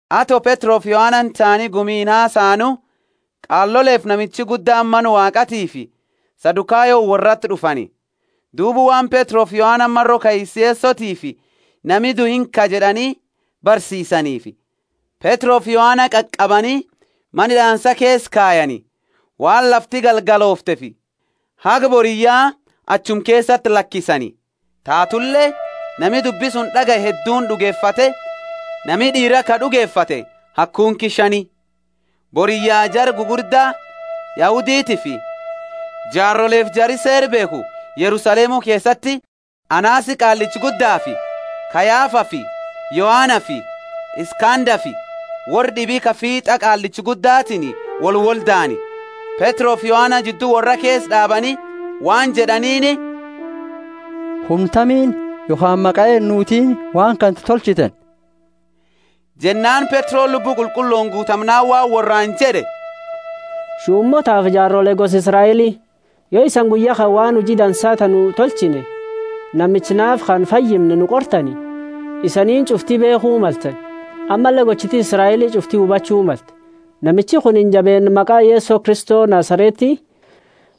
Ato Petrofi Yohanani taani gumiini hasaanu, qaalolefi namicha gudda Mana Waaqatiifi Sadukayoni worrati d'ufani. Duuba Waan Petrofi Yohanani maro kaisa Yesotiifi, Nami due inkaa jed'ani barsiisaniifi, Petrofi Yohana qaqabani mana hid'aansa keesa kayani, waan lafti galgalooftefi haga boriyya achuma keesati lakisani. Taatule nami dubbi suni d'agaye hedduuni d'ugefate; nami d'iira ka d'ugefate haga kunki shani. Boriyya jara gugurda Yahuditiifi jaarolefi jari Seera beekhu Yerusalemu keesati, Anasi Qaallicha Guddafi Kayafafi Yohanafi Iskandafi worra d'ibi ka fiit'a Qaallicha Guddatini wolwoldaani. Petrofi Yohana jiddu worra keesa d'aabani waan jed'aniini, Humna tamiini yokhaani maqa eenutiini waan kana tolchitani? Jennaani Petroni Lubbu Qulqullooni guutamnaani waan worraani jed'e, Shumootaafi jaarole gosa Israeli, Yo isani guyya kana waan huji dansa ta nu tolchine, namicha naafa kana fayyimne nu qortani, isaniini ch'ufti beekhu maltani, ammalle gochiti Israeli ch'ufti hubachu malte, namichi kunini jabeenna maqa Yeso Kristo Nazareti,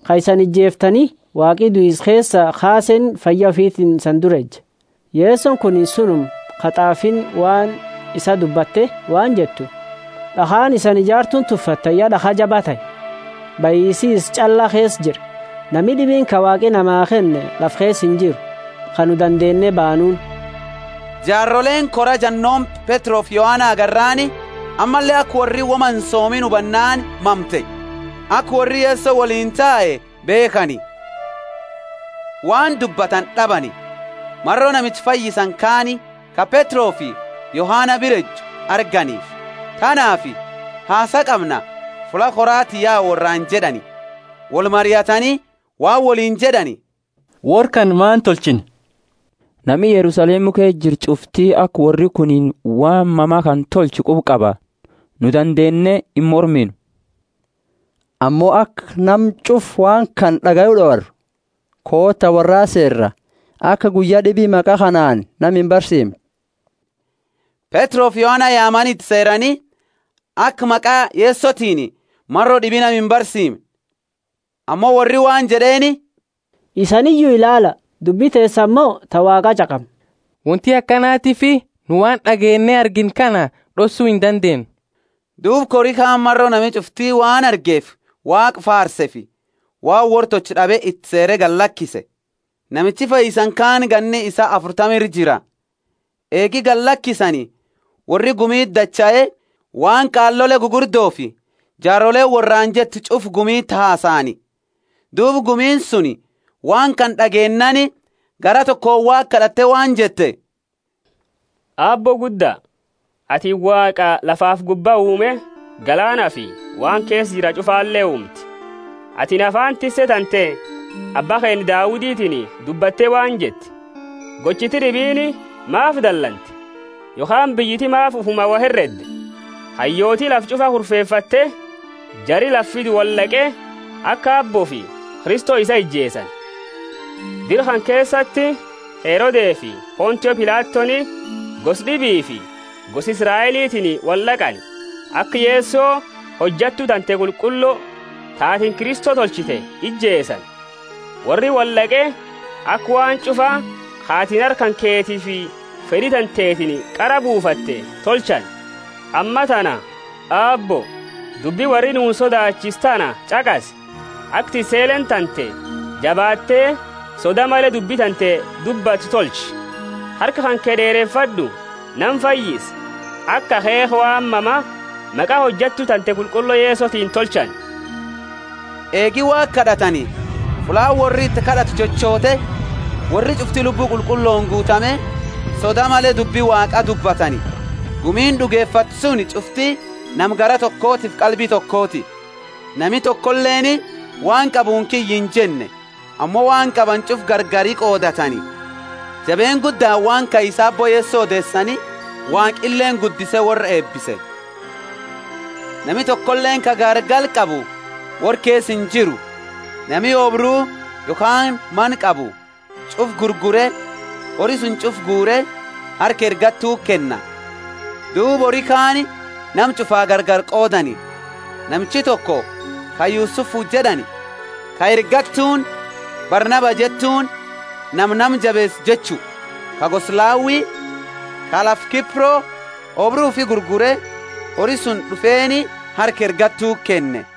ka isani ijeeftani Waaqi duisa keesaa kaaseeni fayya ufitiini isani dura eja. Yesoni kuni sunuma ka t'aafiini waan isaa dubbatte waan jettu, D'akhaani isani ijartuuni tuffattani ya d'akha jaba tahe. Bahisi isa ch'alla keesa jira, nami d'ibiini ka Waaqi namaa kenne lafa keesa injiru, ka nu dandeenne baanuuni. Jaaroleeni kora jannooma Petrofi Yohana arginaani, ammalle aka worri woma insoomiini hubannaani mamte, aka worri Yeso woliini tae beekhani. Waan dubbatani d'abani, maro namicha fayyisani kaani, ka Petrofi Yohana bira eju, arganifi. Tanaafi, Hasaa qamna, fulla korati yaa worraani jed'ani, wolmariatani waan woliini jed'ani, Worra kana maani tolchina? Nami Yerusalemu keesa jiru ch'ufti aka worri kuni waan mama kana tolche quba qaba, nu dandeenne imorminu. Ammo aka nama ch'ufa waan kana d'agayu d'owarru, koota, worrati seera, aka guyya d'ibi maqa kanaani nama imbarsiimne. Petrofi Yohana yaamani iti seeraani, aka maqa Yesotiini maro d'ibi nama imbarsiimne. Ammo worri waan jed'eeni, Isaniyu ilaala, dubbi teesani mo ta Waaqa ch'aqamna? Wonti akanatiifi nu waan d'ageenne argine kana d'ossu indandeenu. Duuba kori kaani maro nami ch'ufti waan argeefi Waaqa faarseefi, waan worra tolchu d'abe iti seere galakise. Namichi fayyisani kaani ganni isaa afurtama ira jira. Eegi gallakisani, worri gumiti dachae, waan qaalole gugurdofi jaaroleeni worraani jette ch'ufa gumiti hasaani. Duuba gumiini suni waan kana d'ageennaani, garaa tokooni Waaqa kad'ate waan jette, Aabbo gudda, atini Waaqa lafafi gubba uume galaanafi waan keesa jira ch'ufale uumte. Atini afaani tisse tante, abba keenna Dauditini dubbatte waan jette, Gochiti d'ibiini maafi dalante, yokhaani biyyiti maafi ufumaa wo heredde? Hayyooti lafa ch'ufa kurfefatte, jari lafa fidu wold'aqe, aka Aabboofi Kristo isaa ijeesani. Dira kana keesati Herodefi Pontio Pilatoni gosa d'ibiifi gosa Israelitiini wold'aqani, aka Yeso, hojattu tante qulqullo, ta atini Kristo tolchite ijeesani. Worri wold'aqe aka waan ch'ufa ka atini harka kanketiifi fed'i tantetiini qara buufatte tolchani. Ammatana, Aabbo, dubbi worri nuuni sodaachiisu tana ch'aqasi, aka tisseleeni tante jabaatte soda male dubbi tante dubbattu tolchi. Harka kanke d'eerefad'u, nama fayyisi, aka akheekha waan mama maqa Hojattu tante qulqullo Yesotiini tolchani. Eegi Waaqa kad'atani, fullaani worri iti kad'atu chochoote, worri ch'ufti Lubbu Qulqullooni guutame, soda male dubbi Waaqa dubbatani. Gumiini d'ugefatte suni ch'ufti nama garaa tokotiifi qalbi tokoti. Nami tokoleeni waan qabuuni kiyya injenne, ammo waan qabani ch'ufa gargari qoodatani. Jabeenna guddaani waan kaisa Aabbo Yeso odeesani, Waaqileeni guddise worra eebise. Nami tokoleeni ka gaargala qabu worra keesa injiru. Nami oobru yokhaani mana qabu, ch'ufa gurgure, hori suni ch'ufa guure, harka ergattuti kenna; duuba hori kaani nama ch'ufaa gargari qoodani. Namichi toko ka Yusufu jed'ani, ka ergattuuni Barnaba jettuuni (Nama nama jabeesu jechu), ka gosa Lawi, ka lafa Kipro, oobru ufi gurgure, hori suni d'ufeeni harka ergattuti kenne.